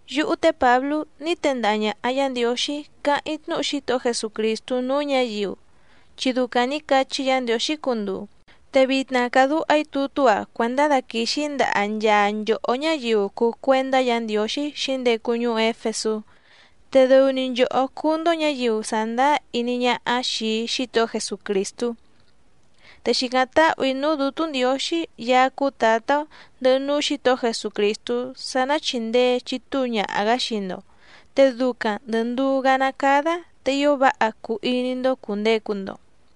Yúhú té Pǎblú ní tendaha ñàha Yá Ndiǒxí càháⁿ‑í tnúhu Xítohó Jesucrìstú núú ñǎyiu, chi ducaⁿ nǐ cachí Yǎ Ndiǒxí cunduu, te vitna càdúha‑í tutú‑a cuèndá daquìxi‑í ndaha nchaa nchòhó ñáyiu cùu cuendá Yǎ Ndiǒxí xǐndecu ñuú Éfesú, te dɨu‑ni nchòhó cúú‑ndó ñǎyiu sàndáá iní ñáhá xìi Xítohó Jesucrìstú. Te xìcáⁿ táhù‑í núú Dǔtú Ndiǒxí Yaá cúú Tǎtá‑ó, ndɨhɨ núú Xǐtohó Jesucrìstú sá ná chìndee chitúu ñaha‑gǎ xii‑ndo, te ducaⁿ ndɨ̀ nduú‑gá ná cádá te ío váha cuu iní‑ndó cùndecu‑ndo.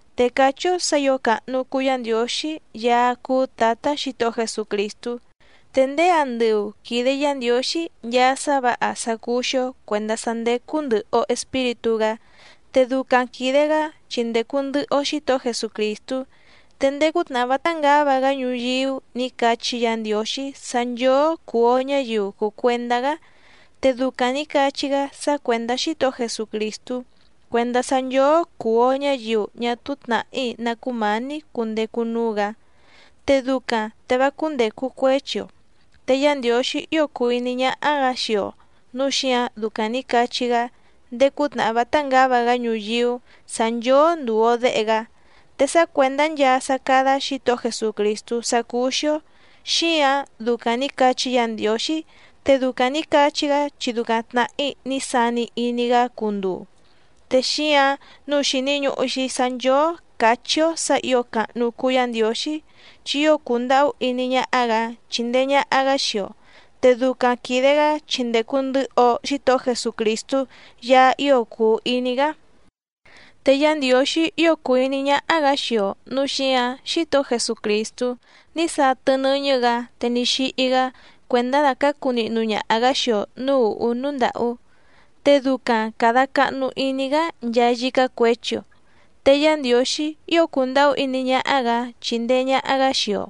Te cachí‑ó sǎ ǐo càhnu cuu Yá Ndiǒxí Yaá cúú Tǎtá Xǐtohó Jesucrìstú, te ndéé andɨu quìde Yá Ndiǒxí nchaa sá vǎha sá cúú‑xí‑ó cuèndá sá ndécú ndɨ̀hɨ‑o Espíritú‑gá, te ducaⁿ quìde‑gá chi ndècu ndɨhɨ‑o Xítohó Jesucrìstú. Te ndéé cútnàhá vátá ngǎva‑gá ñuyíú nǐ cachí Yǎ Ndiǒxí sá nchóó cùu‑o ñáyiu cùu cuendá‑gá, te ducaⁿ nǐ cachí‑gá sá cuèndá Xítohó Jesucrìstú cuèndá sá nchóó cùu‑o ñáyiu ñá túú tnàhí ná cumání cundecu núú‑gǎ, te ducaⁿ te vá cúndècu cuéchi‑o. Te Yá Ndiǒxí ío cùu iní ñáhá‑gǎ xii‑o nǔu xíǎⁿ ducaⁿ nǐ cachí‑gá ndéé cútnàhá vátá ngǎva‑gá ñuyíú sǎ nchóó ndùu‑o déhe‑gá. Te sá cuèndá nchaa sá cádá Xǐtohó Jesucrìstú sá cúú‑xí‑ó, xíǎⁿ ducaⁿ nǐ cachí Yǎ Ndiǒxí, te ducaⁿ nǐ cachí‑gá chi ducaⁿ tnàhí ní sani iní‑gá cunduu. Te xíǎⁿ nǔu xìni ñuhu‑xi sá nchóó càchí‑ó sǎ ǐo càhnu cuu Yá Ndiǒxí, chi ío cùndahú iní ñáhá‑gǎ chíndèe ñaha‑gá xii‑o. Te ducaⁿ quìde‑gá chi ndècu ndɨhɨ‑o Xítohó Jesucrìstú Yaá ío cùu iní‑gá. Te Yá Ndiǒxí ío cùu iní ñáhá‑gǎ xii‑o nǔu xíǎⁿ Xítohó Jesucrìstú ní satɨ nɨ́ñɨ́‑gǎ te ní xíhí‑gá cuèndá dacǎcu nihnu ñaha‑gǎ xii‑o nǔú ùhú núú ndàhú, te ducaⁿ càda cahnu iní‑gá nchaa yícá cuěchi‑o. Te Yá Ndiǒxí ío cùndahú iní ñáhá‑gǎ chíndèe ñaha‑gá xii‑o,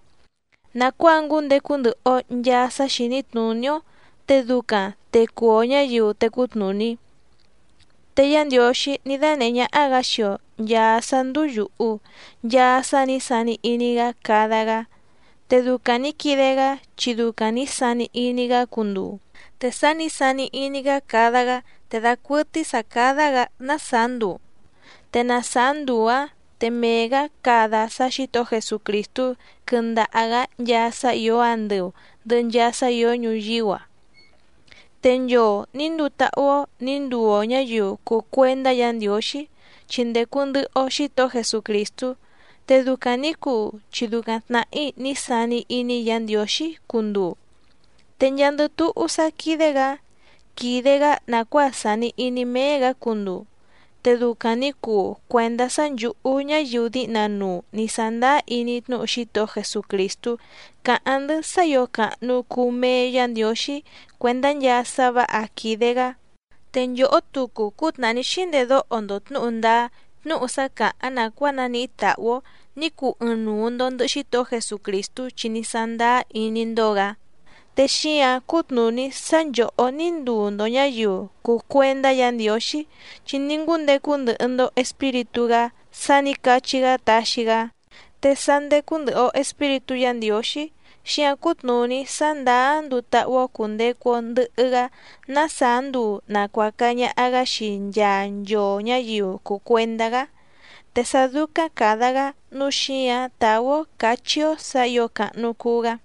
nàcuáa ngúndecu ndɨhɨ‑o nchàa sá xìní tnùní‑ó te ducaⁿ te cuu‑o ñǎyiu tècú tnùní. Te Yá Ndiǒxí ní dánèhé ñáhá‑gǎ xii‑o nchàa sá ndúú yùhu, nchaa sá nǐ sani iní‑gá cada‑gá. Te ducaⁿ nǐ quide‑gá chi ducaⁿ nǐ sani iní‑gá cunduu. Te sá nǐ sani iní‑gá cada‑gá te dacuɨtɨ́í sǎ cádá‑gǎ ná sàá nduu, te na sàá nduu‑áⁿ te mee‑gǎ cada sá Xǐtohó Jesucrìstú quɨndaha‑gǎ nchaa sá ìó andɨu, ndɨhɨ nchaa sá ìó ñuyíú‑a. Te nchoo nǐ nduu táhú‑ó nǐ nduu‑o ñǎyiu cùu cuendá Yǎ Ndiǒxí chi ndècu ndɨhɨ‑o Xítohó Jesucrìstú. Te ducaⁿ nǐ cuu chi ducaⁿ tnàhí ní sani iní Yǎ Ndiǒxí cunduu. Te nchaandɨ túhú sá quídé‑gǎ, quìde‑gá nàcuáa sàni iní méé‑gǎ cunduu. Te ducaⁿ nǐ cuu cuèndá sá nchǔhú ñáyiu díhna nuu nǐ sándáá iní tnúhu Xítohó Jesucrìstú cáháⁿ‑ndɨ́ sá ǐo càhnu cuu mee Yá Ndiǒxí cuèndá nchaa sá vǎha quìde‑gá. Te nchòhó tucu cútnàhá ní xíndedóho‑ndo tnǔhu ndáá tnúhu sá càháⁿ nàcuáa naníhí tàhú‑ó ní cuu ɨɨⁿnuu‑ndo ndɨ̀hɨ Xítohó Jesucrìstú chi ní sándáá iní‑ndó‑gǎ. Te xíǎⁿ cútnùní sá nchòhó ní nduu‑ndo ñǎyiu cùu cuendá Yǎ Ndiǒxí, chi ní ngúndecu ndɨhɨ‑ndo Espíritú‑gá sá nǐ cachí‑gá taxi‑gá. Te sá ndécú ndɨ̀hɨ‑o Espíritú Yǎ Ndiǒxí xíǎⁿ cútnùní sá ndàá nduu táhú‑ó cùndecu‑o ndɨhɨ‑gá ná sàá nduu nàcuaca ñaha‑gá xii nchaa nchoo ñǎyiu cùu cuendá‑gá, te sá dúcáⁿ càda‑gá nǔu xíǎⁿ tàú‑ó càchí‑ó sǎ ǐo càhnu cuu‑gá.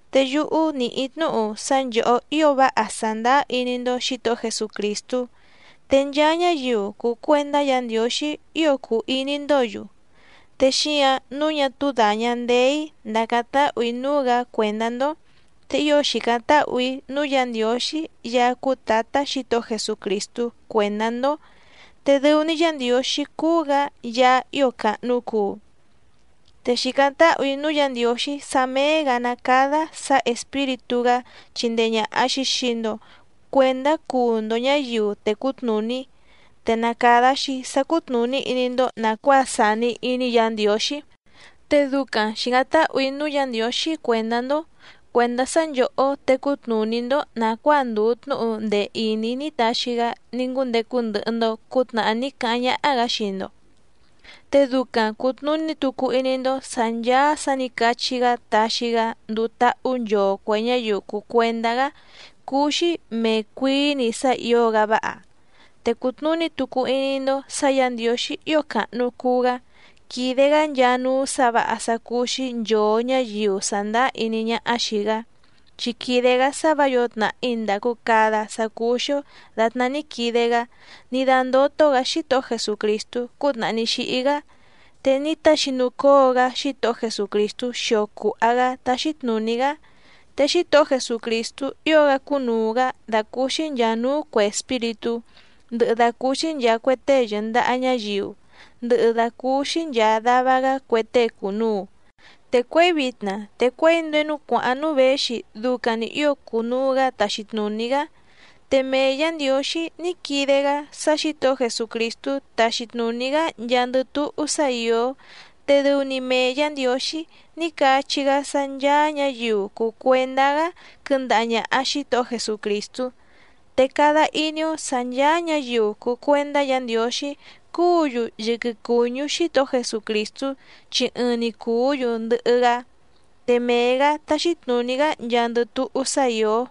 Te yúhú nìhí‑í tnúhu sá nchòhó ío váha sàndáá iní‑ndó Xǐtohó Jesucrìstú, te nchaa ñáyiu cùu cuendá Yǎ Ndiǒxí ío cùu iní‑ndǒ‑yu. Te xíǎⁿ nǔu ñá túú dàña ndeé‑í ndàcáⁿ táhù‑í núú‑gǎ cuèndá‑ndó, te ío xìcáⁿ táhù‑í núú Yǎ Ndiǒxí Yaá cúú Tǎtá Xǐtohó Jesucrìstú cuèndá‑ndó. Te dɨu‑ni Yá Ndiǒxí cúú‑gǎ Yaá ío càhnu cuu. Te xìcáⁿ táhù‑í núú Yǎ Ndiǒxí sá méé‑gǎ ná cádá sǎ Espíritú‑gá chindee ñàha‑xi xii‑ndo cuendá cuu‑ndo ñǎyiu tècú tnùní, te na càda‑xi sá cútnùní iní‑ndó nàcuáa sàni iní Yǎ Ndiǒxí. Te ducaⁿ xìcáⁿ táhù‑í núú Yǎ Ndiǒxí cuèndá‑ndó, cuèndá sá nchòhó tecú tnùní‑ndó nàcuáa ndùu tnúhu ndee ìní ní taxi‑gá ní ngúndecu ndɨhɨ‑ndo cǔtnàhá ní cáháⁿ ñáhá‑gǎ xii‑ndo. Te ducaⁿ cùtnuní tucu iní‑ndó sǎ ncháá sǎ nǐ cachí‑gá taxi‑gá nduu táhú nchoo cuè ñáyiu cùu cuendá‑gá cúú‑xí mèe cuií‑ni sá ǐo‑gá váha. Te cùtnuní tucu iní‑ndó sǎ Yǎ Ndiǒxí ío càhnu cuu‑gá quídé‑gǎ nchaa núú sǎ vǎha sá cúú‑xí nchòo ñáyiu sàndáá iní ñáhá xìi‑gá, chi quìde‑gá sá vǎ yǒo tnàhí ndàcu cada sá cúú‑xí‑ó dàtná ní quide‑gá ní dándótó‑gǎ Xítohó Jesucrìstú cútnàhá ní xíhí‑gá. Te ní taxinucóo‑gá Xítohó Jesucrìstú xio cùha‑gá táxí tnùní‑gá. Te Xítohó Jesucrìstú ío‑gá cúnùu‑gá dàcúúxí nchàa núú cuè espíritú, ndɨhɨ dàcúúxí nchàa cue tée yɨ̀ndaha ñáyiu, ndɨhɨ dàcúúxí nchàa dava‑gá cue tée cùnuu. Te cuěi vitna te cuěi ndéé núú cuàháⁿ núú věxi ducaⁿ‑ni ǐo cunuu‑gǎ taxi tnùní‑gá. Te mee Yǎ Ndiǒxí ní quide‑gá sá Xǐtohó Jesucrìstú taxi tnùní‑gá nchaandɨ túhú sá ìó, te dɨu‑ni mee Yǎ Ndiǒxí ní cachí‑gá sá ncháá ñǎyiu cùu cuendá‑gá quɨndaha ñàha Xítohó Jesucrìstú. Te cada iní‑ó sǎ ncháá ñǎyiu cùu cuendá Yǎ Ndiǒxí cúǔ‑yu yɨquɨ cùñú Xítohó Jesucrìstú, chi ɨɨⁿ‑ni cùú‑yu ndɨhɨ‑gá, te mee‑gǎ táxí tnùní‑gá nchaandɨ túhú sá ìó.